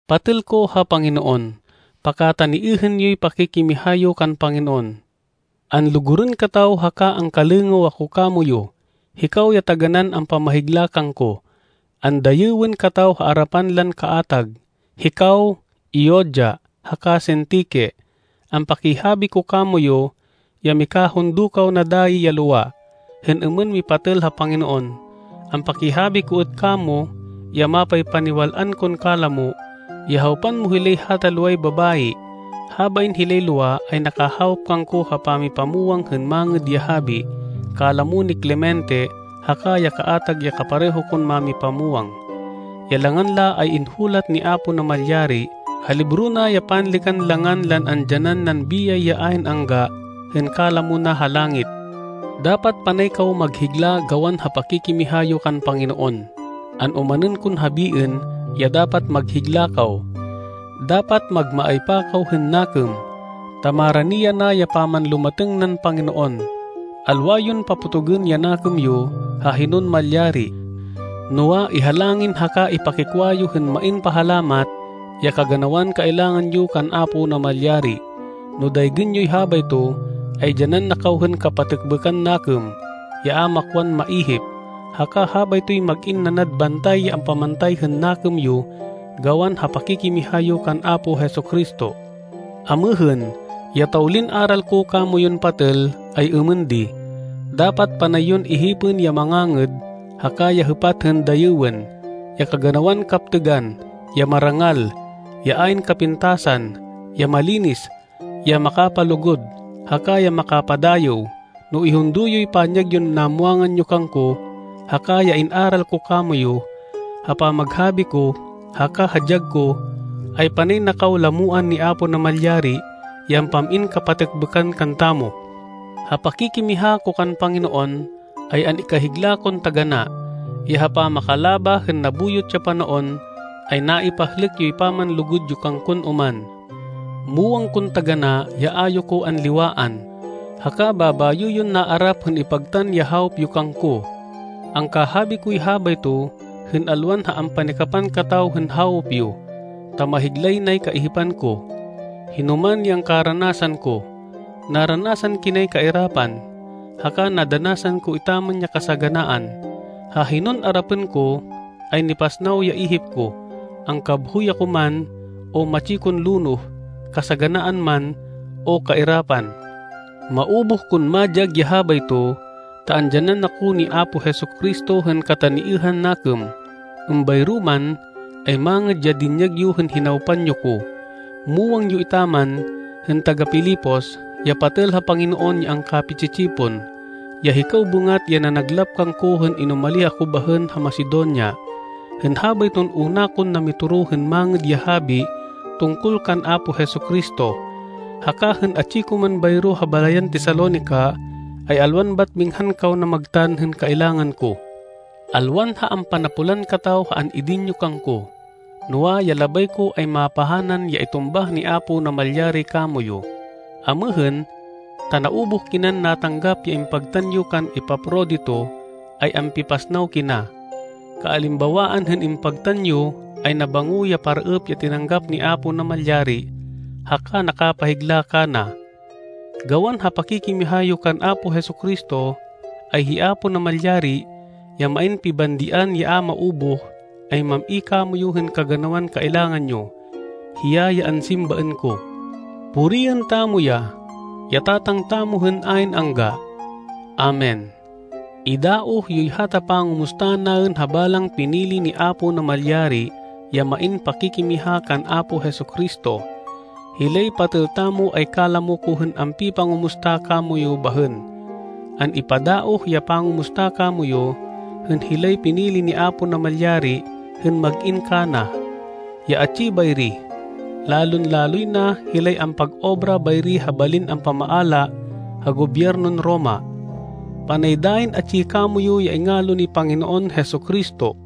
Patêl ko ha Panginoon, pakataniêhên yoy pakikimiha yo kan Panginoon. Anlugurên kataw haka angkalêngêw ako kamoyu. Hikaw ya taganán ampamahigla kangko. Andayêwên kataw ha arapan lan kaatag. Hikaw, Euodia haka Sintique, ampakihabi ko kamoyu, ya mikahundo kaw na dayi ya lowa, hên êmên mipatêl ha Panginoon. Ampakihabi ko êt kamo, ya mapaypaniwal-an kon kalamo, ya hawpan mo hilay hata loway babayi. Habain hilay lowa ay nakahawop kangko ha pamipamwang hên Mangêd ya Habi, kalamo ni Clemente haka ya kaatag ya kapareho kon mámipamwang. Ya langan la ay inhulat ni Apo Namalyari ha libro na ya panlêkan langan lan andyanan nan biyay ya ayn angga, hên kalamo na ha langit. Dapat panay kaw maghigla gawan ha pakikimiha yo kan Panginoon. An-omanên kon habiên ya dapat maghigla kaw. Dapat magmaaypa kaw hên nakêm, ta marani yana ya pamanlumatêng nan Panginoon. Alwa yon papotogên ya nakêm yo ha hinon malyari. Noa, ihalangin haka ipakikwa yo hên main pahalamat, ya kaganawan kailangan yo kan Apo Namalyari. No daygên yoy habayto, ay dyanan na kaw hên kapatêkbêkan nakêm, ya a makwan maihip, haka habaytoy mag-in nanad bantay ya ampamantay hên nakêm yo gawan ha pakikimiha yo kan Apo Jesu-Cristo. Amêhên, ya tawlin aral ko kamoyun patêl, ay êmên di: dapat panay yon ihipên ya mangangêd, haka ya hêpat hên dayêwên: ya kaganawan kaptêgan, ya marangal, ya ayn kapintasan, ya malinis, ya makapalugud, haka ya makapadayêw. No ihundo yoy panyag yon namwangan yo kangko, haka ya in-aral ko kamoyu, ha pamaghabi ko, haka ha dyag ko, ay panay na kaw lamoan ni Apo Namalyari, ya ampam-in kapatêkbêkan kantamo. Ha pakikimiha ko kan Panginoon, ay an-ikahigla kon taganá, ya ha pamakalabah hên nabuyot ya panaon, ay naipahlêk yoy pamanlugud yo kangkon oman. Muwang kon taganá ya a yo ko anliwaan, haka babayo yon naarap hên ipagtan ya hawop yo kangko. Angkahabi koy habayto hên alwan ha ampanikapan kataw hên hawop yo, ta mahiglay nay kaihipan ko, hinoman ya angkaranasan ko. Naranasan kinay kairapan, haka nadanasan ko etaman ya kasaganaan. Ha hinon arapên ko, ay nipasnaw ya ihip ko, angkabhoy ako man, o matsi kon lonoh, kasaganaan man, o kairapan. Maubuh kon madyag ya habayto, ta andyanan na ko ni Apo Jesu-Cristo hên kataniêhan nakêm. Êmbayro man, ay mangêd ya dinyag yo hên hinawpan yo ko. Muwang yo etaman hên taga-Filipos, ya patêl ha Panginoon ya angkapi-tsi-tsipon, ya hikaw bêngat ya nanaglap kangko hên inumalih ako bahên ha Macedonia, hên habayton una kon namitoro hên Mangêd ya Habi tungkol kan Apo Jesu-Cristo. Haka hên atsi ko man bayro ha balayan Tesalonica, ay alwan bat minghan kaw namagtan hên kailangan ko. Alwan ha ampanapolan kataw ha an-idin yo kangko, noa, ya labay ko ay mapahanan ya itumbah ni Apo Namalyari kamoyu. Amêhên, ta naubuh kinan natanggap ya impagtan yo kan Epafrodito ay ampipasnaw kina. Kaalimbawaan hên impagtan yo ay nabango ya paraêp ya tinanggap ni Apo Namalyari haka nakapahigla kana. Gawan ha pakikimiha yo kan Apo Jesu-Cristo, ay hi Apo Namalyari, ya main pibandian ya a maubuh, ay mam-i kamoyu hên kaganawan kailangan yo. Hiya ya ansimbaên ko. Puriên tamo ya, ya Tatang tamo hên ayn angga. Amen. Idaoh yoy hata pangumusta naên ha balang pinili ni Apo Namalyari ya main pakikimiha kan Apo Jesu-Cristo. Hilay patêl tamo ay kalamo ko hên ampipangumusta kamoyu bahên. An-ipadaoh ya pangumusta kamoyu, hên hilay pinili ni Apo Namalyari hên mag-in kana, ya atsi bayri, lalon-laloy na hilay ampag-obra bayri ha balin ampamaala ha Gobyernon Roma. Panay dayin atsi kamoyu ya ingalo ni Panginoon Jesu-Cristo.